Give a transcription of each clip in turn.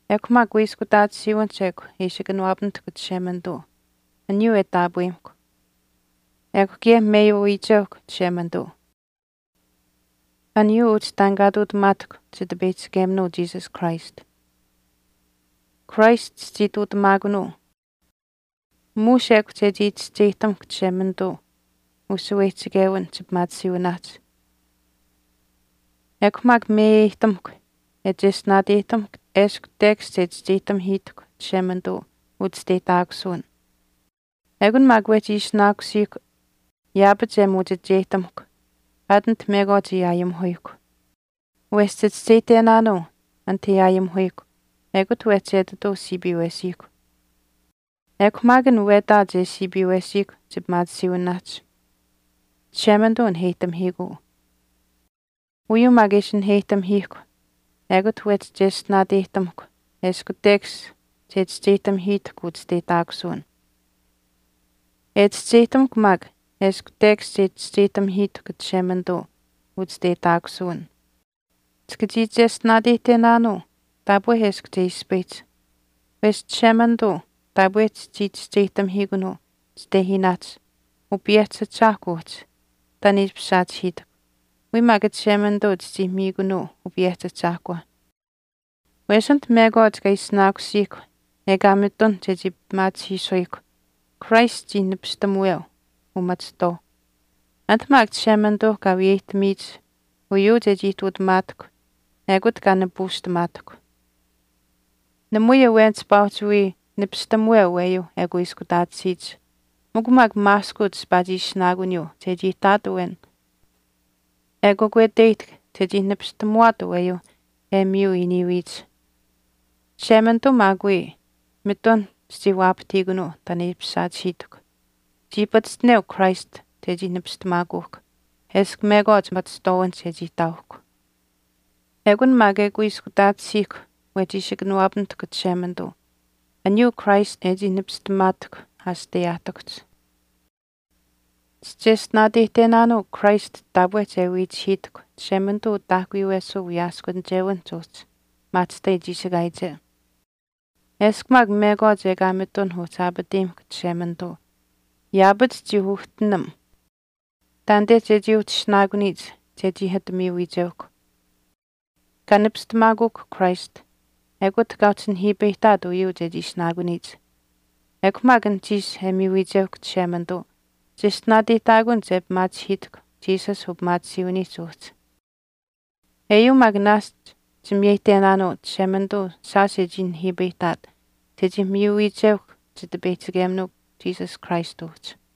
14Ekw maak kuiskutaatisiiwinihch ekw e ishi kanawaapamitahkw Chishemanituu aniyuu e taapweyimahkw. Ekw kaye meyuu wiicheuhkw Chishemanituu aniyuu uhchi taan kaa ihtuutamaatahkw Chitipeyihchikeminuu Jesus Christ. Christ chichii ihtuutamaakunaanuu muush ekw chechii chischeyihtamukw Chishemanituuh ushaweyihchichewin chipimaatisiiwinaahch. Ekw maak meyeyihtamuhkw e cheshtinaateyihtamuhkw eshkw tekash che chischeyihtamihiitahkw Chishemanituu uchisteyihtaakusuwin. Ekun maak wehchi ishinaakusiihkw yaapach e muuchicheyihtamukw aat anit mekwaach e aayimihuyihkw, wesh chichischeyihtenaanuu anit an e aayimihuyihkw ekut wehchi etituu siipiiwesiihkw. Ekw maak an wetaach e siipiiwesiikw chipimaatisiiwinaahch Chishemanituu naheyihtamihiikuu. Uyuu maak e ishi naheyihtamihiihkw ekut wehchi cheshtinaateyihtamuhkw eshkw tekash che chischeyihtamihiitahkw uchisteyihtaakusuwin. E chischeyihtamukw maak eshkw tekash che chischeyihtamihiitahkw Chishemanituu uchisteyihtaakusuwin, chika chii cheshtinaateyihtenaanuu taapwe eshkw che ispayihch, wesh Chishemanituu taapwe chichii chischeyihtamihiikunuu chitehiinaahch Upayehchii Ahchaahkw uhchi, taan e ishpish saachihiitahkw. Wiya maak Chishemanituu chichii miikunuu Upayehchi Ahchaahkwa. Wesh anit mekwaach kaa ishinaakusiihkw ekaa mitun chechii pimaachihiisuyihkw, Christ chii nipistamuweu umachihtwaau. Anit maak Chishemanituuh kaa wiyeyihtamiyich uyuu chechii ihtuutamaatahkw ekut kaa nipuushtamaatahkw. Namui awen chipaa uhchi wii nipistamuweu aweyuu e kuiskutaatisiyich mikw maak maaskuuch chipaa chii ishinaakuniyuu chechii ihtaat awen e kakweteyihtahk chechii nipistamuwaat aweyuu e miyu iiniiwiyich. Chishemanituu maak wii mitun chichii waapahtiikunuu taan e ishpish saachihiitahkw, chii pachishtineu Christ chechii nipistamaakuuhkw eshkw mekwaach machihtwaawinihch e chii ihtaauhkw. Ekun maak e kuiskutaatisiihkw wehchi ishi kanawaapamitahkw Chishemanituu aniyuu Christ e chii nipistamaatahk asiteyaahtikuhch. Chicheshtinaateyihtenaanuu Christ taapwe che wiihkuchihiitahkw Chishemanituu utaahkuyuwesuu wiyaaskunichewiniihch uhchi maahchishtai chiishikaayiche. Eshkw maak mekwaach ekaa mitun uhchi aapateyimahkw Chishemanituu yaapach chii uhtinam taanite chechii uhchi ishinaakuniyich chechii ati miyu wiicheuhkw. Kaa nipistamaakuuhkw Christ ekut kaa uhchi nihiipayihtaat uyuu chechii ishinaakuniyich. Ekw maak anuhchiish e miyuwicheuhkw Chishemanituu cheshtinaateyihtaakun che pimaachihiitahkw Jesus upimaatisiiwiniihch uhchi. Eyuu maak naashch chimiyeyihtenaanuu Chishemanituu shaash e chii nihiipayihtaat chechii miyu wiicheuhkw Chitipeyihchikeminuu Jesus Christ uhchi.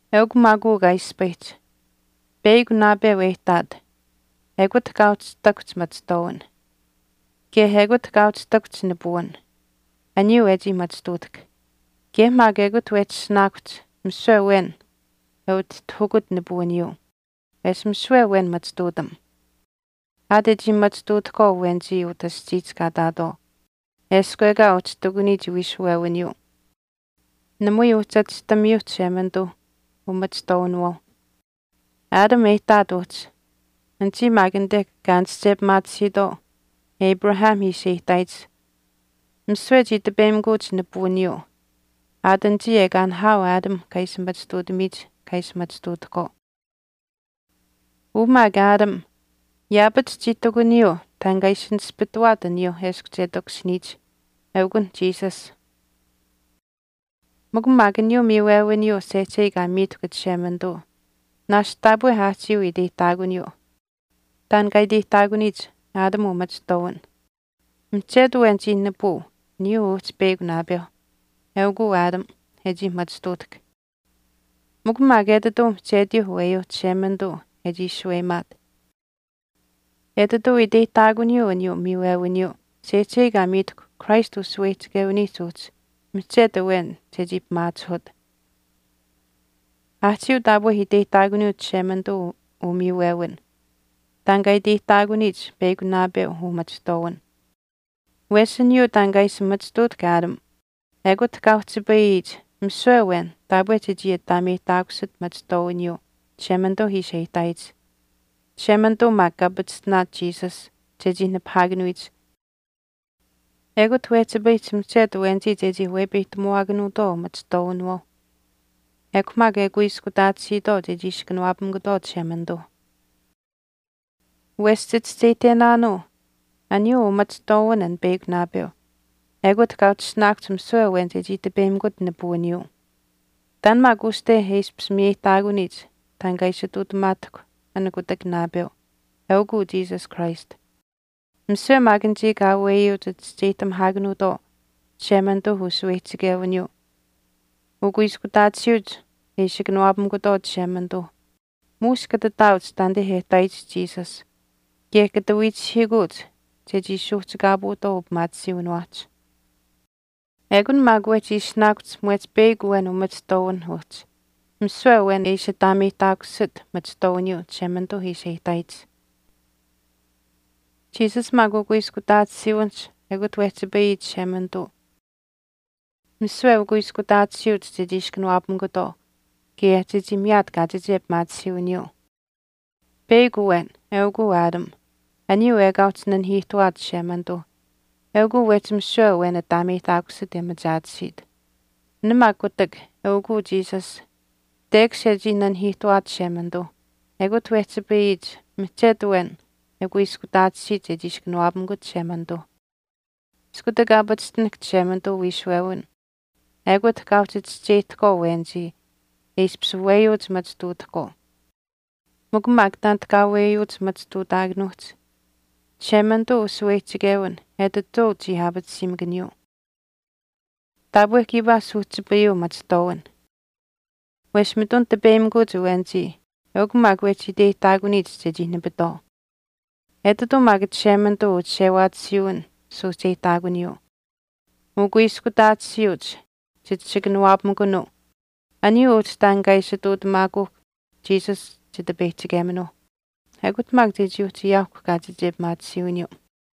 Eukw maak uu kaa ispayihch, peyakw naapeu e ihtaat ekut kaa uhchi ihtakuhch machihtwaawin kaye ekut kaa uhchi ihtakuhch nipuwin aniyuu e chii machituutahk. Kaye maak ekut wehchi ishinaakuhch misiwe awen e utihtahukut nipuwiniyuu, wesh misiwe awen machituutam. Aat e chii machituutahkwaau awenichii utah aschiihch kaa ihtaatwaau eshkw ekaa uhchi ihtakuniyich wiishuwewiniyuu, namui uhchi achihtamiyuu Chishemanituu umachituutamuwinawaauh. Adam e ihtaat uhchi anichii maak anite kaa aanische pimaatisiitwaau Moses ishi e ihtaayich misiwe chii tipeyimikuuch nipuwiniyuu aat anichii ekaa nihaau Adam kaa ishi machituutamiyich kaa ishi machituutahkwaau. Uu maak Adam yaapach chii ihtakuniyuu taan kaa ishi nispituwaat aniyuu eshkw che takushiniyich, eukunh Jesus. Mikw maak aniyuu miiwewiniyuu sehchei kaa miitahkw Chishemanituu naashch taapwe aahchiiuh iteyihtaakuniyuu taan kaa iteyihtaakuniyich Adam umachihtuutamuwin. Mihchetu awen chii nipuu aniyuu uhchi peyakw naapeu, eukuu Adam, e chii machituutahk. Mikw maak etituu mihchetiyuu aweyuuh Chishemanituu e chii shaweyimaat. Etituu iteyihtaakuniyuu aniyuu miiwewiniyuu sehchei kaa miitahkw Christ ushaweyihchichewiniihch uhchi mihchetu awen chechii pimaachihut. Aahchiiuh taapwe iteyihtaakuniyuu Chishemanituu umiiwewin taan kaa iteyihtaakuniyich peyakw naapeu umachihtuutamuwin. Wesh aniyuu taan kaa ishi machituutahk Adam ekut kaa uhchipayiyich misiwe awen taapwe chechii ataameyihtaakusit machihtwaawiniyuu Chishemanituu ishi e ihtaayich. Chishemanituu maak kaa pachishtinaat Jesus chechii nipahaakanuyich ekut wehchipayihch mihchetu awenichii chechii wepeyihtamuwaakanuutwaau umachituutamuwinawaauh ekw maak e kuiskutaatisiitwaau che ishi kanawaapamikutwaau Chishemanituuh. Wesh chichischeyihtenaanuu aniyuu umachihtwaawin an peyakw naapeu ekut kaa uhchi ishinaakuhch misiwe awen chechii tipeyimikut nipuwiniyuu. Taan maak uste e ishpish miyeyihtaakuniyich taan kaa ishi ihtuutamaatahkw an kutak naapeu, eukuu Jesus Christ. Misiwe maak anichii kaa weyuuch chischeyihtamihaakanuutwaau Chishemanituu ushaweyihchichewiniyuu ukuiskutaatisiiuch e ishi kanawaapamukutwaau Chishemanituu muush kata taauch taanite e ihtaayich Jesus kaye kata wiichihiikuuch chechii suuhchikaapuutwaau upimaatisiiwiniwaahch. Ekun maak wehchi ishinaakuhch mwehch peyakw awen umachihtwaawinh uhchi misiwe awen e ishi ataameyihtaakusit machihtwaawiniyuu Chishemanituu ishi e ihtaayich. Jesus maak ukuiskutaatisiiwinihch ekut wehchipayiyich Chishemanituu misiwe ukuiskutaatisiiuch chechii ishi kanawaapamikutwaau kaye chechii miyaat kaachiche pimaatisiiwiniyuu. Peyakw awen, eukuu Adam, aniyuu ekaa uhchi nanihiihtuwaat Chishemanituu eukuu wehchi misiwe awen ataameyihtaakusit e machaatisiit. An maak kutak, eukuu Jesus, tekash e chii nanihiihtuwaat Chishemanituuh ekut wehchipayiyich mihchet awen e kuiskutaatisiit chechii ishi kanawaapamikut Chishemanituu. Iskutak kaa pachishtinahk Chishemanituu uwiishuwewin ekut kaa uhchi chischeyihtahkwaau awenichii e ishpish weyuuch machituutahkwaau. Mikw maak taanit kaa weyuuch machituutaakanuuhch Chishemanituu ushaweyihchichewin etituu chii aapatisiimakaniyuu. Taapwe kiipaa suuhchipayuu machihtwaawin. Wesh mitun tipeyimikuuch awenichii eukw maak wehchii iteyihtaakuniyich chechii nipitwaau. Etituu maak Chishemanituu uchishewaatisiiwin suuhcheyihtaakuniyuu. Ukuiskutaatisiiuch chit ishi kanawaapamikunuu aniyuu uhchi taan kaa ishi ihtuutamaakuuhk Jesus Chitipeyihchikeminuuh. Ekut maak chechii uhchi ayaauhkw kaachiche pimaatisiiwiniyuu.